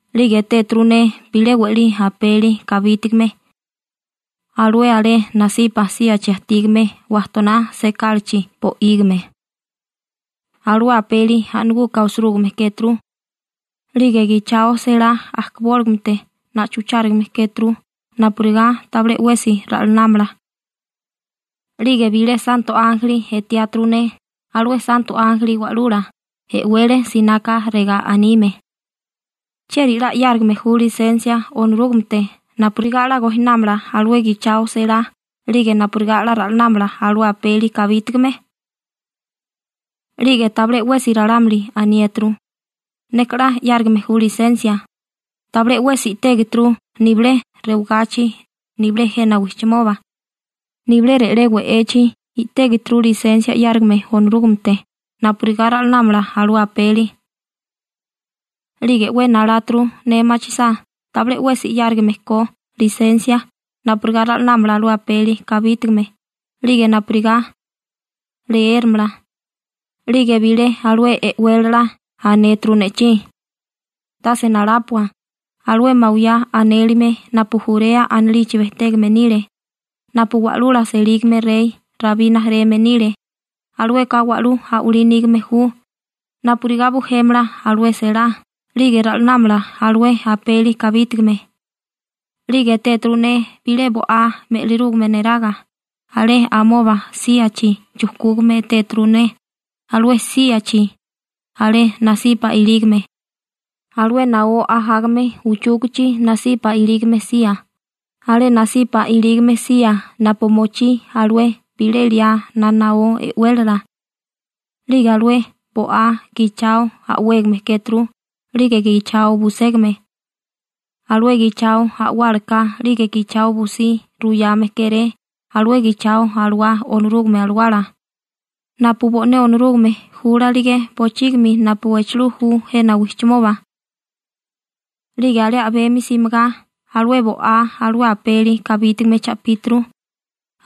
'Lige etéturu ne bilé we'lí apeli kabítigame alué alé nasipa síachi ajtígame wajtoná sekálachi bo'ígime. Alué apeli a'naguka osirúgime kéturu, 'lige gichao selá ajkabóligamete na'chuchárigame kéturu napurigá tabilé 'wesi ra'lanámala. 'Lige bilé santo ánjeli etiáturu ne alué santo ánjeli wa'lula e'wele sináká regá anime: ―¿Chieri 'la 'yárigame ju lisensia Onorúgamete napurigá 'la gojinámala alué gichao selá 'lige napurigá ra'lanámala alué apeli kabítigame? 'Lige tabilé 'wesi ralámuli aniéturu: «Neka 'la 'yárigame ju lisensia.» Tabilé 'wesi i'tégeturu nibilé rewagachi, nibilé jena wijchimoba, nibilé re'lé we'echi i'tégeturu lisensia 'yárigame Onorúgamete napurigá ra'lanámala alué apeli. 'Lige 'we naláturu ne machisá tabilé 'wesi 'yárigame ko lisensia napurigá ra'lanámala alué apeli kabítigame, 'lige napurigá leéramala. 'Lige bilé alué e'wélala anéturu ne'chí: ―Tase nalápua, alué Mawiyá anélime napu Jurea anilichi bejtégame nile, napu wa'lula selígame rey Rabí rijimala nile, alueka wa'lú a'walí nígame ju napurigá bujémala alué selá 'lige ra'lanámala alué apeli kabítigame. 'Lige etéturu ne bilé bo'á me'lirúgame neraga, alé amoba síachi chujkúgame etéturu ne, alué síachi alé nasipa ilígame, alué naó ajágame uchúkichi nasipa ilígame sía, alé nasipa ilígame sía napu mochí alué bilé liá na naó e'wélala. 'Lige alué bo'á gichao a'wégame kéturu 'lige gichao buségame. Alué gichao a'wálaka 'lige gichao busí ruyame kéré alué gichao alawá Onorúgame Alawala, napu bo'né Onorúgame júlalige bochígimi napu echelú ju jena wijchimoba. 'Lige alé a'bemi simigá, alué bo'á alué apeli kabítigame cha'píturu,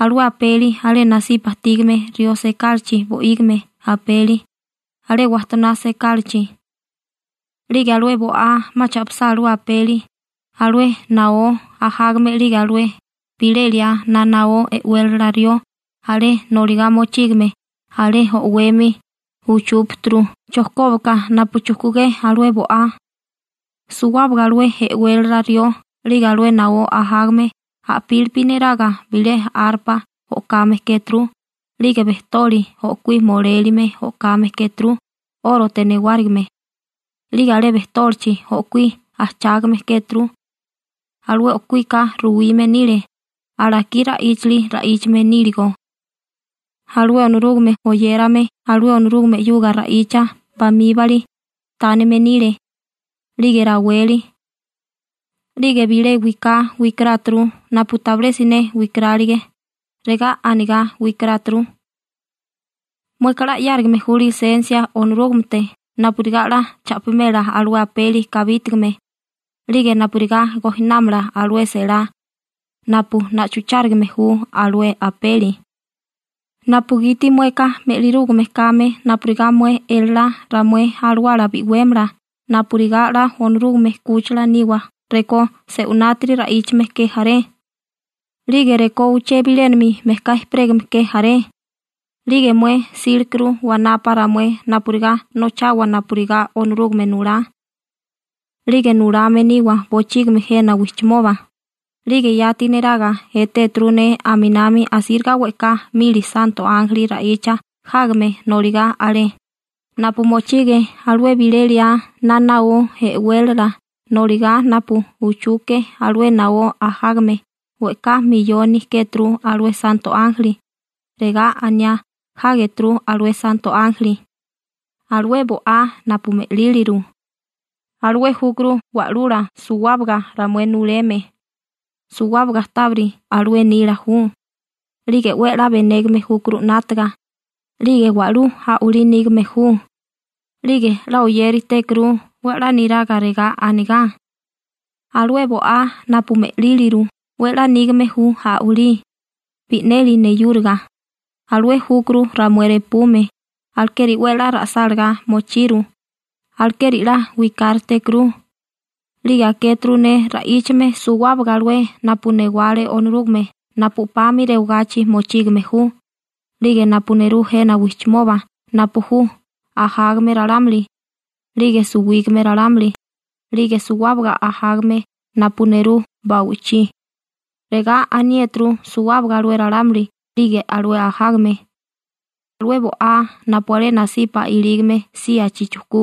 alué apeli alé nasipa ajtígame rió sekálachi bo'ígime apeli, alé wajtoná sekálachi. 'Lige alué bo'á 'ma cha'pisá alué apeli, alué naó ajágame 'lige alué bilé liá na naó e'wélala rió alé noligá mochígame alé o'wemi uchúpaturu chojkóbaka napu chujkugé alué bo'á. Suwábaga alué e'wélala rió 'lige alué naó ajágame a'pílipi neraga bilé arpa o'kame kéturu 'lige bejtoli o'kuí molélime o'kame kéturu 'órote newárigime, 'lige alé bejtólichi o'kuí ajchágame kéturu. Alué o'kuíka ruwime nile alakí ra'íchali ra'íchame níligo alué Onorúgame oyérame alué Onorúgame 'yuga ra'icha bamíbali tánime nile, 'lige raweli. 'Lige bilé wiká wikaráturu napu tabilé siné wikarálige, regá anigá wikaráturu: Mueka 'la 'yárigame ju lisensia Onorúgamete napurigá 'la cha'pimela alué apeli kabítigame 'lige napurigá gojinámala alué selá napu na'chuchárigame ju alué apeli, napugiti mueka me'lirúgame kame napurigá mué elalá ramué alawala bi'wémala napurigá 'la Onorúgame 'kúchila niwa rekó se'winátiri ra'íchame ke jaré, 'lige rekó uché bilénami mejká ejperégame ke jaré. 'Lige mué 'sílekuru wanapa ramué napurigá nochawa napurigá Onorúgame nulá, 'lige nulame niwa bochígimi jena wijchimoba. 'Lige yati neraga etéturu ne aminami asíriga we'ká mili santo ánjeli ra'icha jágame noligá alé, napu mochige alué bilé liá na naó e'wélala noligá napu uchuke alué naó ajágame, we'ká miyoni kéturu alué santo ánjeli, regá aniá jágeturu alué santo ánjeli: Alué bo'á napu me'líliru alué júkuru Wa'lula suwábaga ramué nuleme suwábaga tábiri alué nila ju 'lige 'we 'la benégame júkuru 'nátaga 'lige wa'lú a'walí nígame ju. 'Lige 'la oyéritékuru 'we 'la niraga regá anigá: «Alué bo'á napu me'líliru 'we 'la nígame ju a'walí bi'neli neyúriga alué júkuru ramué repume alekeri 'we 'la ra'sálagá mochiru alekeri 'la wikáritékuru.» 'Lige akéturu ne ra'íchame suwábaga alué napu newale Onorúgame napu 'pami rewagachi mochígame ju, 'lige napu nerú jena wijchimoba napu ju ajágame ralámuli, 'lige suwígame ralámuli, 'lige suwábaga ajágame napu nerú ba'wichí, regá aniéturu suwábaga alué ralámuli 'lige alué ajágame: Alué bo'á napu alé nasipa ilígame síachi chujkú,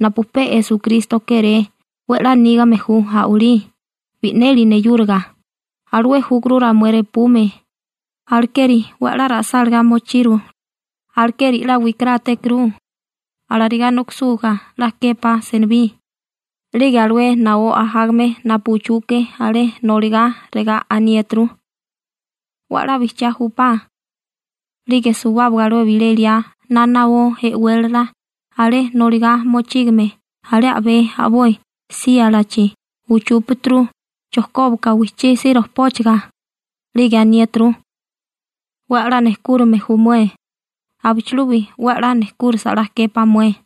napu pe Esukristo kéré 'we 'la nígame ju a'walí bi'neli neyúriga alué júkuru ramué repume, alekeri 'we 'la ra'sálagá mochiru, alekeri 'la wikarátékuru. Alarigá nokisúgá 'la képá senibí. 'Lige alué naó ajágame napu uchuke alé noligá regá aniéturu: ―¡'We 'la bijchiá júpá! 'Lige suwábaga alué bilé liá na naó e'wélala alé noligá mochígame alé a'bé a'boi síalachi uchúpaturu chojkóbaka wijchísí rojpóchaga, 'lige aniéturu: ―'We 'la nejkúrime ju mué, abichilubi 'we 'la nejkúrisa 'la képá mué.